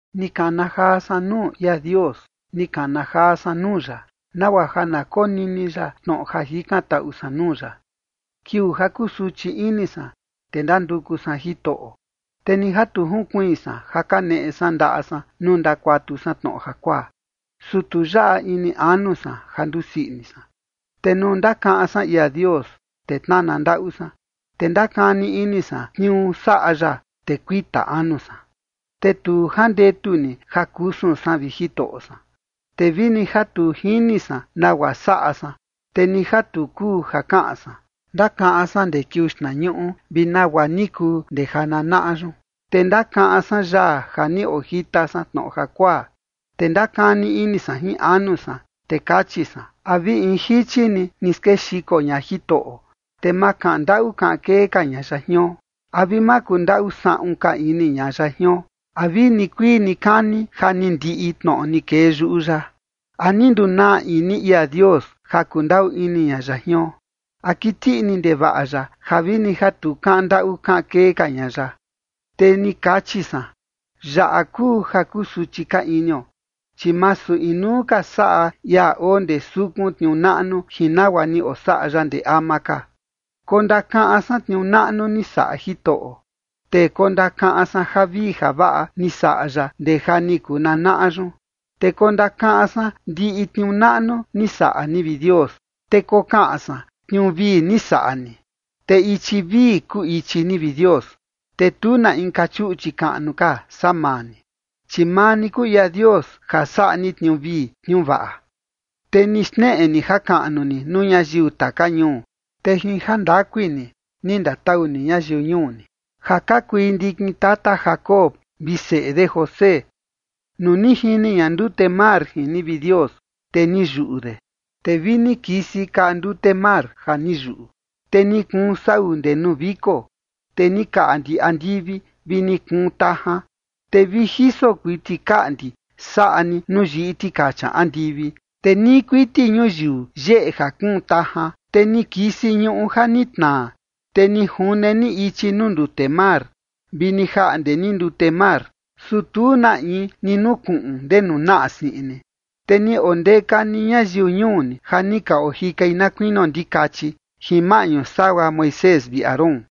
Ni kana jaa san nuu ia Dios, ni kana jaa san nuu ya, nagua ja na konini ya tnoꞌo ja jikantaꞌu san nuu ya. Kiuu ja kusuchi ini san, te ndanduku san Jitoꞌo, te ni ja tu jinkuiin san ja kaneꞌe san ndaꞌa san nuu ndakuatu san tnoꞌo jakuaa, su tu yaꞌa ini anu san ja ndusii ini san. Te nuu ndakaꞌan san ia Dios, te tnana ndaꞌu san, te ndakani ini san tniuu saꞌa ya, te kuita anu san. Te tu jandetu ni ja kusun san, vi Jitoꞌo san, te vini ja tu jini san nagua saꞌa san, te ni ja tu kuu ja kaꞌan san. Ndakaꞌan san ndee kiuu xtnañuꞌu vi nagua ni kuu ndee jananaꞌa yun. Te ndakaꞌan san yaa ja ni ojita san tnoꞌo jakuaa, te ndakani ini san jin anu san, te kachi san: “¿A vi in jichi ni, ni skexiko ña Jitoꞌo, te ma kaꞌan ndaꞌu kaꞌan kee ka ña ya jion? ¿A vi ma kundaꞌu saꞌun ka ini ña ya jion? ¿A vi nikuii nikani ja ni ndiꞌi tnoꞌo ni kee yuꞌu ya? ¿A ni ndunaa ini ia Dios ja kundaꞌu ini ña ya jion? ¿A kiti ini ndevaꞌa ya ja vini ja tu kaꞌan ndaꞌu kaꞌan kee ka ña ya?” Te ni kachi san: “Yaꞌa kuu ja kusuchi ka inio, chi masu inuu ka saꞌa ia oo ndee sukun tniuu naꞌnu jin nagua ni osaꞌa ya ndee ama ka”. Kondakaꞌan san tniuu naꞌnu ni saꞌa Jitoꞌo, te kondakaꞌan san javii javaꞌa ni saꞌa ya ndee ja ni kuu nanaꞌa yun. Te kondakaꞌan san ndiꞌi tniuu naꞌnu ni saꞌa ni, vi Dios, te kokaꞌan san tniuu vii ni saꞌa ni. Te ichi vii kuu ichi ni, vi Dios. Te tu na inka chuꞌchi kaꞌnu ka saa maa ni. Chi maa ni kuu ia Dios ja saꞌa ni tniuu vii tniuu vaꞌa, te ni xneꞌe ni jakaꞌnu ni nuu ñayiu taka ñuu. Te jin jandakui ni, ni ndatau ni ñayiu ñuu ni, ja ka kui ndikin tata Jacob vi seꞌe de José. Nuu ni jini ña ndute mar jin ni, vi Dios, te ni yuꞌu de, te vi ni kisi kaꞌa ndute mar ja ni yuꞌu. Te ni kuun sau ndee nuu viko, te ni kaꞌndi andivi, vi ni kuun tajan. Te vi jiso kuiti kaꞌndi saꞌa ni nuu yiꞌi tikacha andivi, te nii kuiti ñuyiu yeꞌe ja kuun tajan, te ni kisi ñuꞌu ja ni tnaa. Te ni june ni ichi nuu ndute mar, vi ni jaꞌnde ni ndute mar, su tu na in ni nukuꞌun ndenu naꞌa siꞌin ni. Te ni ondeka ni ñayiu ñuu ni ja ni ka ojikai na kuinio ndikachi, jin maꞌñu sagua Moisés vi Aarón.